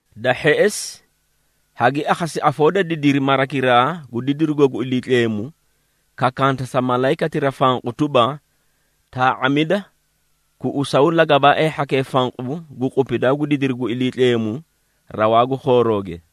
Da hheꞌesi, hagi akhasi afoo da didiri marakiraa gu didirugo gu Iliitleemu, kakanta sa malayikatira fanqu tuba, “Taa⁄amida, kuꞌusaw lagabaaee hhakee fanqu gu qupidaa gu didiri gu Iliitleemu rawaa gu khoorooge.”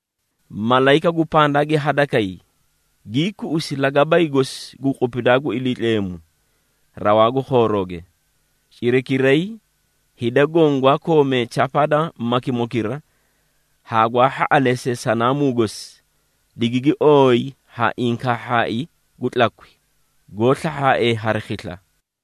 Malayika gu pandaa gi hadakay, gii kuꞌusi lagabay gosi gu qupidaa gu Iliitleemu, rawaa gu khoorooge. Cirakiray, hida goõ gwaa koomee chapaa da makimokira haa gwaa hhaꞌaleesee sanaamuu gosi, digigi ooyi ha inkaahhaai gu tlakwi, goó slahhaaee hari khisla.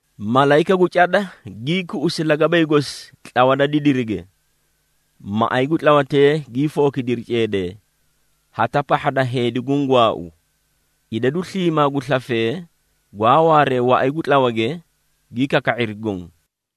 Malayika, gu cada gii kuꞌusi lagabay gosi tlawa da didirige. Maꞌay gu tlawatee gii fookidiri ceedee, hata pahha da heedi guũ gwaau, idadu sliimaa gu slafee, gwaa waaree waꞌay gu tlawage gi kaka⁄iri goõ.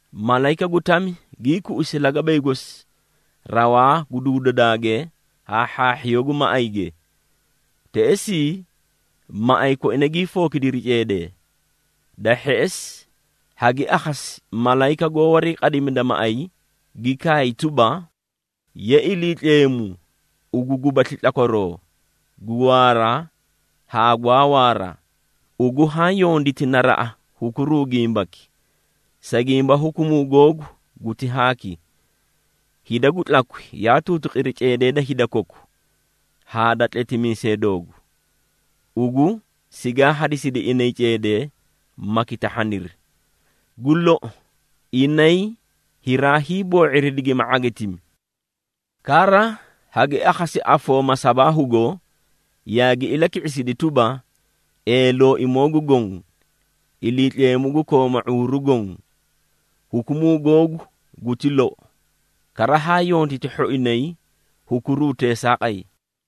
Malayika gu tami gii kuꞌusi lagabay gosi rawaa gu duudadaage haa hhaahhiyoo gu maꞌayge, teꞌesii, maꞌay koina gii fookidiri ceedee. Da hheꞌesi, hagi akhasi malayika goó wariiqadimida maꞌay, gi kaay tuba, “Ye Iliitleemu ugu gubasli tlakwaroo, gu waara haa gwaa waara, Ugu haã yonditi naraꞌa, hukuruu gimbaki. Sa gimba hukumuu googu guti haaki. Hida gu tlakwi yaa tuutuqiri ceedee da hida koku, haa da tletimiisee doogu, ugu sigaa hadisidi inay ceedee, ma kitahhaniri. Gu lou, inay hiraa hiiboo⁄iri digima ⁄agitimi!” Kara hagi akhasi afoo masabaahugo yaagi ilaki⁄isidi tuba, “Ee Looimoo gu Goõ, Iliitleemu gu kooma ⁄uuru goõ, hukumuu googu guti lou, kara haa yonditi hhoinay hukuruu teesaaqay.”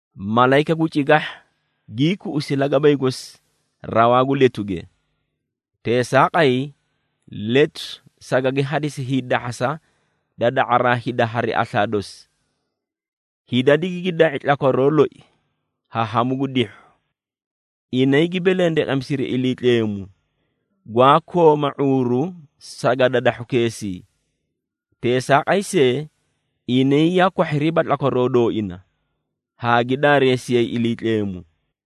Malayika gu cigahha gii kuꞌusi lagabay gosi rawaa gu letuge. Teesaaqay letu sagagi hadisi hiidahhasa da da⁄araa hida hari aslaa dosi. Hida digigi da⁄i tlakwaroo loi ha hamu gu dihhu. Inay gi belendeqemisiri Iliitleemu, gwaa kooma ⁄uuru sagadadahhukeesii. Teesaaqay see, inay yaa kwahhiriiba tlakwaroo dooina haa gi daareesiyay Iliitleemu.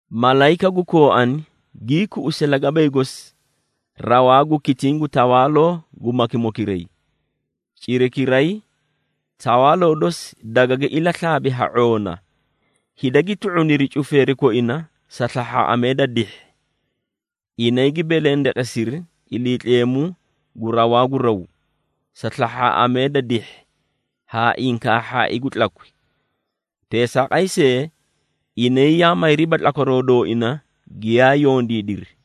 Malayika gu kooani gii kuꞌusi lagabay gosi rawaa gu kitiĩ gu tawaaloo gu makimokiray. Cirakiray, tawaaloo dosi dagagi ilaslaabi ha ⁄oona, hida gi tluꞌuniri cufeeri koina sa slahhaaꞌamee da dihhi. Inay gi belendeqesiri Iliitleemu gu rawaa gu raw, sa slahhaaꞌamee da dihhi haa inkaahhaai gu tlakwi. Teesaaqay see, inay yaa mayriiba tlakwaroo dooina giyaa yondiidiri.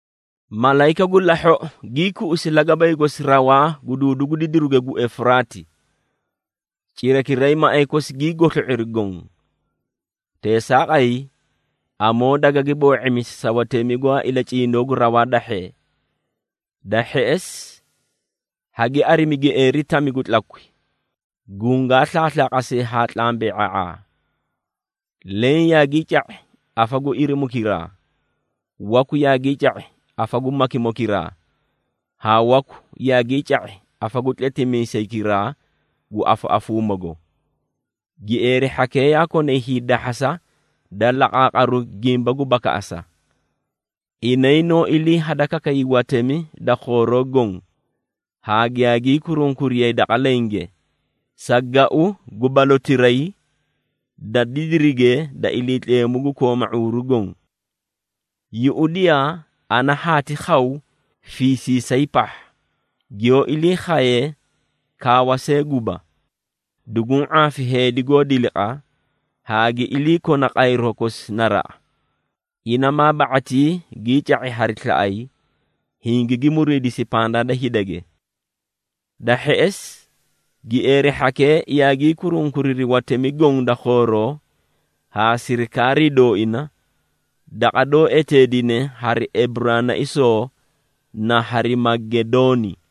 Malayika gu lahhoꞌo gii kuꞌusi lagabay gosi rawaa gu duudu gu didiruge gu Efuraati. Cirakiray maꞌay kosi gii goslo⁄iri goõ. Teesaaqay, amoo dagagi boo⁄imisi sa watemi gwaa ilacindoo gu rawaa dahhee. Da hheꞌesi, hagi arimi gieeri tami gu tlakwi, gungaa slaaslaaqasee haa tlambe⁄a⁄aa. Leẽ yaagii ca⁄i afa gu irimukiraa, waku yaagii ca⁄i afa gu makimokiraa, haa waku yaagii ca⁄i afa gu tletimiisaykiraa gu afaꞌafuumago. Gieeri hhakee yaa konay hiidahhasa da laqaaqaru gimba gu bakaꞌasa. Inay noó ilii hadakakayay watemi da khooroo goõ, haa giyaa gii kurunkuriyay daqa lenge, sa gau gu balotiray da didirige da Iliitleemu gu kooma ⁄uuru goõ. “Yuꞌudiyaa! Ana haati khaw fiisiisay pahha, giyoó ilii khaye kaawa see guba! Duguũ ⁄aafi heedi goó diliqa, haa gi iliikona qayroo kosi naraꞌa, ina maa ba⁄atii gii ca⁄i hari slaꞌay, hingigi muriidisi pandaa da hidage.” Da hheꞌesi, gieeri hhakee yaagii kurunkuriri watemi goõ da khooroo haa sirikaarii dooina, daqa doó eteedine hari Eburaanaisoo na Harimagedooni.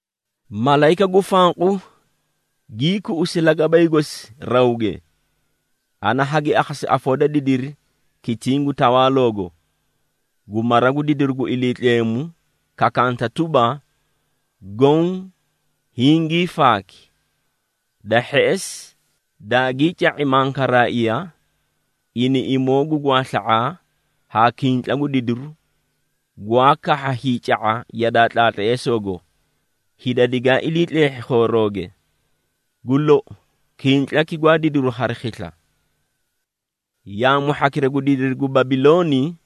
Malayika gu fanqu gii kuꞌusi lagabay gosi rawge. Ana hagi akhasi afoo da didiri kitiĩ gu tawaaloogo, gu mara gu didiru gu Iliitleemu kakaanta tuba, “Goõ hingii faaki!” Da hheꞌesi, daagii ca⁄i mankaraaiya, iniꞌimoo gu gwaasla⁄aa, haa kintla gu didiru, gwaa kahha hiica⁄a yadaa tlaatleesoogo, hida digaa ilii tleehhi khoorooge. Gu lou, kintlaki gwaa didiru hari khisla! Yaamu hhakira gu didiri gu Babilooni,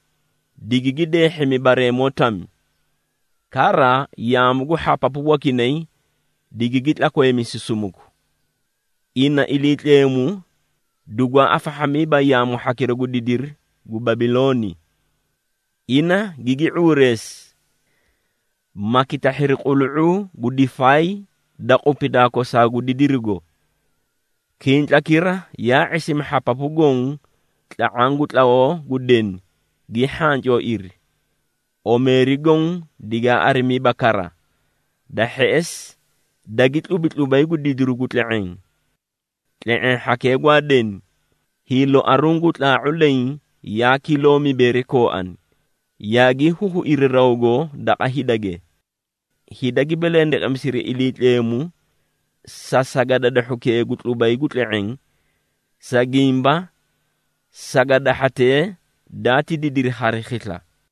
digigi deehhimi bareemoo tami, kara yaamu gu hhapapu wakinay digigi tlakweemisi sumuku. Ina Iliitleemu dugwaa afahhamiiba yaamu hhakira gu didiri gu Babilooni. Ina gigi ⁄uureesi, ma kitahhiri qulu⁄uu gu difaay da qupidaa kosaa gu didirigo. Kintlakira yaa ⁄isimi hhapapu goõ tla⁄aã gu tlawoo gu deni gii hhancooiri, omeeri goõ digaa arimiiba kara. Da hheꞌesi, dagi tlubi tlubay gu didiru gu tle⁄eẽ. Tle⁄eẽ hhakee gwaa deni, hiiloaruũ gu tlaa⁄u leẽ yaa kiloo mibeeri kooani, yaagii huhuiri rawgo daqa hidage. Hida gi belendeqemisiri Iliitleemu, sa sagadadahhukee gu tlubay gu tle⁄eẽ, sa gimba, sagadahhatee daati didiri hari khisla.